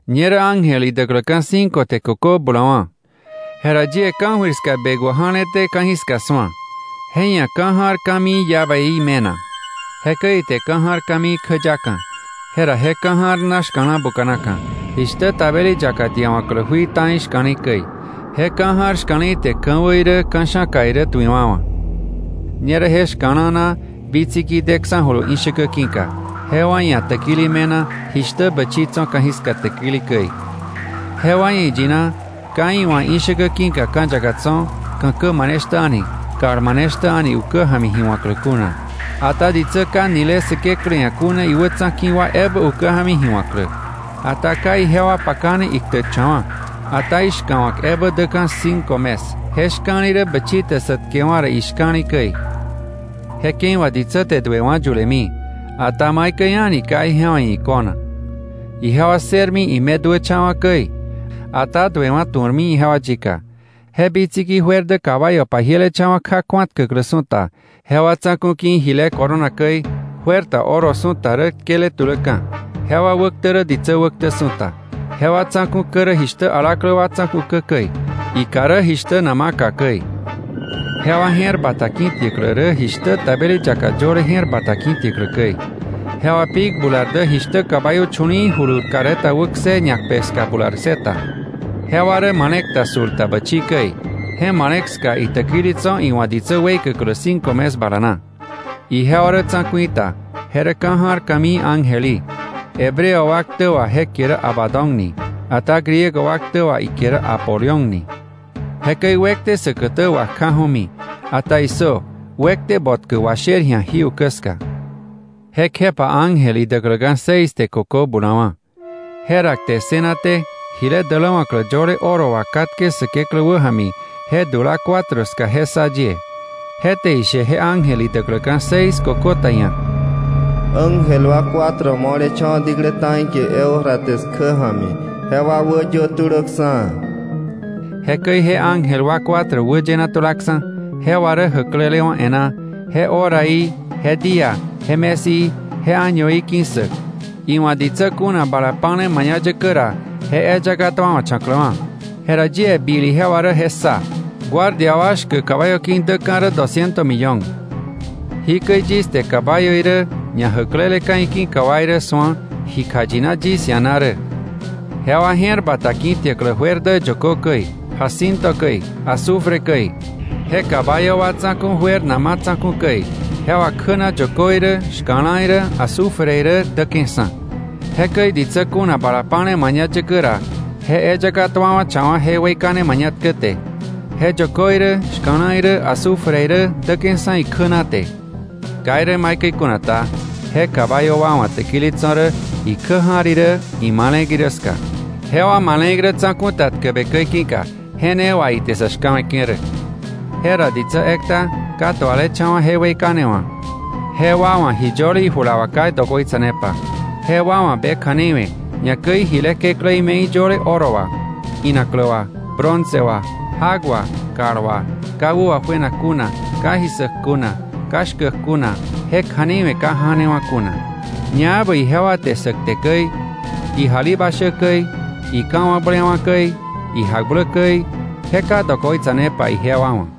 Ñerä ángel idäkläka̱ cinco te kökö bulawa̱. Jera yie ka̱jöir ska bekwä ja̱leté ka̱jiska su̱a. Je ia̱ ka̱ ja̱r ka̱mii llaveí me̱na. Jekäi ite ka̱ ja̱r ka̱mii kjäyaka̱, jera je ka̱ ja̱r na shka̱la̱ buka̱naka̱, jishtä tabeli yaka diawa̱klä jui ta̱i shka̱le̱i käi. Je ka̱ ja̱r shka̱le̱i te ka̱wä irä ka̱sha̱ka irä tuiwa̱wa̱. Ñerä je shka̱la̱ na bitsiki deksa̱julu ishäkä ki̱ka, jewa ia̱ täkili me̱na jishtä bächi tso̱ ka̱jiska täkili käi. Jewa ia̱ iyina, ka iwa̱ ishäkä ki̱ka ka̱ yaka tso̱, ka̱kä maneshtä a̱ni, kal maneshtä a̱ni ukä ja̱mi ji wa̱klä kuna, ata ditsä ka nile Säkeklä ia̱ kuna iwätsa̱ ki̱ wa ebä ukä ja̱mi ji wa̱klä. Ata ka ijewa pakane iktäkcha̱wa̱, ata ishka̱wa̱k ebä däka̱ cinco mes. Je shka̱li̱ rä bächi te sä tkewa̱ ra ishka̱li käi. Je ke̱i wà ditsä te duewa̱ yulemi, ata maikäi a̱ni ka ijewa ia̱ iko̱nak. Ijewa ssërmi ime duächa̱wa̱ käi, ata duewa̱ tu̱rmi ijewa yika. Je bitsiki juer dä caballo pajielecha̱wa̱ kja kju̱atkäklä su̱ta, jewa tsa̱ku̱ ki̱ jile corona käi, juer ta oro su̱ta rä tkele tuläka̱, jewa wäktä rä ditsä wäktä su̱ta. Jewa tsa̱ku̱ kä rä jishtä alaklä wa tsa̱ku̱ kä käi, ikà rä jishtä nama kà käi. Jewa je̱r bata ki̱tiäklä rä jishtä tabeli yaka yöle je̱r bata ki̱tiäklä käi. Jewa pik bular dä jishtä caballo chu̱li̱i̱ julur carreta wäkse ñakpe ska bular ssëta. Jewa rä male̱k ta sul ta bächi käi. Je imale̱k ska itäkili tso̱ iwa̱ ditsä weikäklä cinco mes bala na. Ijewa rä tsa̱ku̱i ta, je rä ka̱ ja̱r ka̱mii ángel í. Hebreo wa ktä wà je kie rä Abadón ni, ata Griego wa ktä wà ikie rä Apolión ni. Jekäi “wekte” säkätä wakjaju̱mi, ata ¡issö! “Wekte” botkä washer ji̱a jí ukä ska. Jekjepa ángel idäkläka̱ seis te kökö bulawa̱. Jera kte ssënaté jile däläwa̱klä yöle oro wà katke Säkeklä wäja̱mi je dula cuatro ska je ssa yie, je te ishe je ángel idäkläka̱ seis kökö ta ia̱: “Ángel wa cuatro mo̱lecha̱wa̱ diklä ta̱i kie Eufrates kjä ja̱mi, jewa wäyö tulöksa̱.” Jekäi je ángel wa cuatro wäyena tulaksa̱, jewa rä jäklelewa̱ e̱ná, je horaí, je día, je mes í, je añoí ki̱ssäk, iwa̱ ditsä kuna bala pa̱le mañayäkä ra je eyaka tuawa̱cha̱kläwa̱. Jera yie bil ijewa rä je ssa: guardia wa shkäk caballo ki̱, däka̱ rä dosciento millone. Jikäi yis te caballo irä ñajäkleleka̱ iki̱ka wa irä su̱a ji kjayina yis ia̱ na rä: Jewa je̱r bata ki̱tiäklä juer dä yökö käi, jacinto käi, azufre käi. Je caballo wa tsa̱ku̱ juer nama tsa̱ku̱ käi, jewa kjä na yökö irä, shka̱la irä, azufre irä däke̱ksa̱. Jekäi ditsä kuna bala pa̱le mañayäkä ra je eyaka tuawa̱cha̱wa̱ je weikane mañatkä te; je yökö irä shka̱la̱ irä azufre irä däke̱ksa̱ ikjä na te. Ka irä maikäi kuna ta, je caballo wa wa̱ täkili tso̱ rä ikjä ja̱r irä imale̱k irä ska, jewa male̱k rä tsa̱ku̱ ta tkäbe käi ki̱ka; je ne wà ite sa̱ shka̱we̱ke̱ rä. Jera ditsä ekta ka tualecha̱wa̱ je weikane wa̱, jewa wa̱ ji yöle ijula wà ka dokoitsa̱nepa, jewa wa̱ be kja̱nei we̱, ñakäi jile kekläí me̱i yöle oro wà, inaklä wà, bronce wà, jak wà, kal wà, ka wä wajuenak kuna, ka ji ssäk kuna, ka shkäk kuna je kja̱nei we̱ ka janewa̱ kuna. Ñaebä ijewa te sä kte käi, ijalibashä käi, ika̱wakblewa̱ käi, ijakblä käi je ka dokoitsanepa ijewa wa̱.